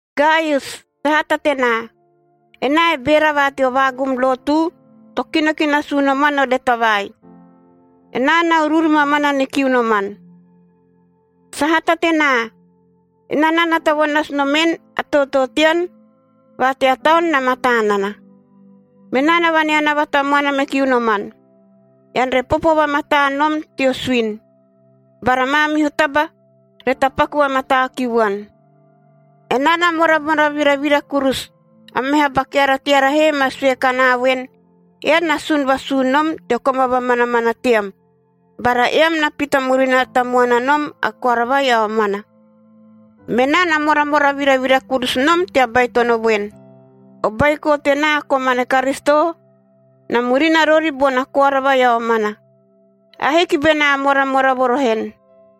Gaius, sahata tenaa! Enaa e beera va teo vaagum lotu to kino ki nasu unoman o leta vai. Enaa na uruuru mamana ni kiu noman. Sahata tenaa! Enaa na nata vo nasu nomen, a tootoo tean va tea taun na mataa nana. Menaa na vaneanava tamuana me kiu noman, ean re popo vamataa nom teo suini, bara maamihu taba re tapaku vamataa ki vuan. Enaa na moramora viravira kurusu, a meha ba keara teara he ma sue kanaa voen, eam na sun vasuu nom teo koma vamanamana team bara eam na pita murina tamuana nom a koara vai a omana. Menaa na moramora viravira kurusu nom tea baitono voen, o baiko tenaa komane Karisito, na murina rori bona koara vai a omana. Ahiki benaa moramora vo roho en.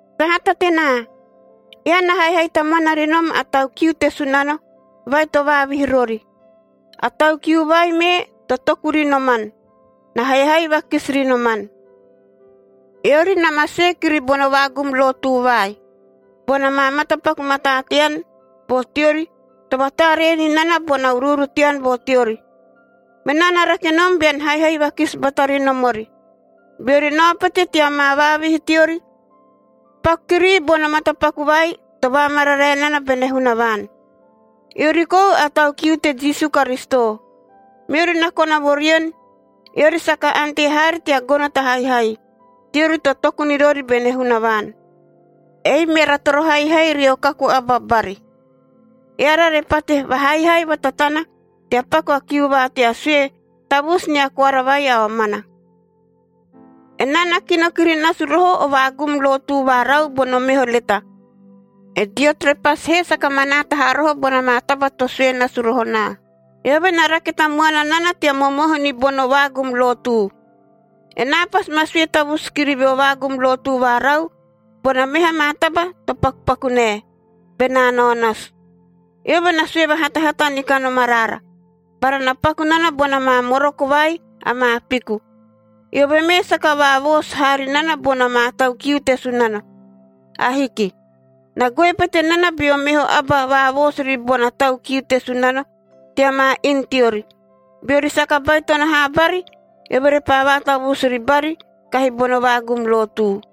Sahata tenaa! Ean na haihai tamuana ri nom a tau kiu te Sunano vai to vaavihi rori. A tau kiu vai mee to toku ri noman, na haihai vakisi ri noman. Eori na ma sue kiri bono vaagum lotu vai, bona maa matapaku mataa tean vo teori to vataaree ni nana bona uruuru tean vo teori. Menaa na rake nom bean haihai vakisi bata ri nom ori, beori nao pete tea maa vaavihi teori. Paku kirii bono matapaku vai to vaamararae nana bene Hunavaan. Eori kou a tau kiu te Jisu Karisito, meori na kona vo rien, eori saka ante haari tea gono ta haihai, teori to toku ni rori bene Hunavaan. Ei meara toro haihai rio kaku aba bari, eara re pate vahaihai vatatana tea paku a kiu va tea sue tavusu nia koara vai a omana. Enaa na kino kiri nasu roho o vaagum lotu varau bono meho leta. E Diotrepes he saka manaata haa roho bona maa taba to sue nasu roho naa. Eove na rake tamuana nana tea momohu ni bono vaagum lotu. Enaa pasi ma sue tavusu kiri veo vaagum lotu varau bona meha maa taba to pakupaku nae, benaa nao nasu. Eove na sue vahatahata ni kanom araara, bara na paku nana bona maa moroko vai amaa piku. Eove mee saka vaavoosu haa ri nana bona maa tau kiu te Sunano. Ahiki. Na goe pete nana beo meho aba vaavoosu ribona tau kiu te Sunano tea maa inu teori. Beori saka baitono haa bari, eove repaa vaatavusu ribari kahi bono vaagum lotu.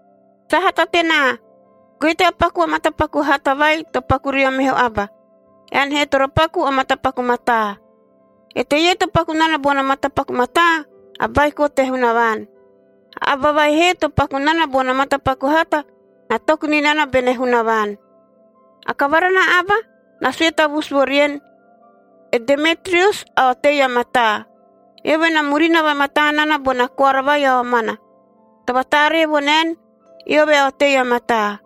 Sahata tenaa! Goe tea paku o matapaku hata vai to paku rio meho aba. Ean he toro paku o matapaku mataa. Eteie to paku nana bono matapaku mataa, a baiko te Hunavaan. A aba vai he to paku nana bono matapaku hata, na toku ni nana bene Hunavaan. A kavara na aba na sue tavusu vo rien, e Demetrius a otei a mataa. Eove na murina vamataa nana bona koara vai a omana, to vataaree vo naen, eove a otei a mataa.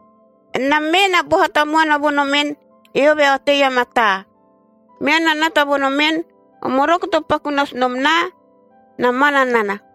Enam mee na boha tamuana vo nomen, eove a otei a mataa. Meam na nata vo nomen, o moroko to paku nasu nom naa na mana nana.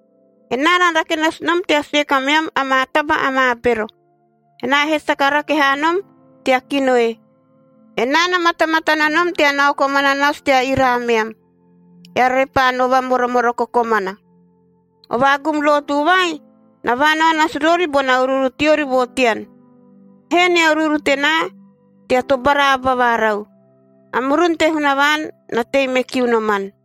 Enaa na rake nasu nom tea sue kameam amaa taba amaa bero, enaa he saka rake haa nom tea kino e. Enaa na matamatana nom tea nao komana nasu tea ira ameam, eara repaa no vamoromoroko komana. O vaagum lotu vai, na vaanao nasu rori bona uruuru teori vo tean. Hee nia uruuru tenaa tea tobara aba varau. A murun te Hunavaan na tei me kiu noman.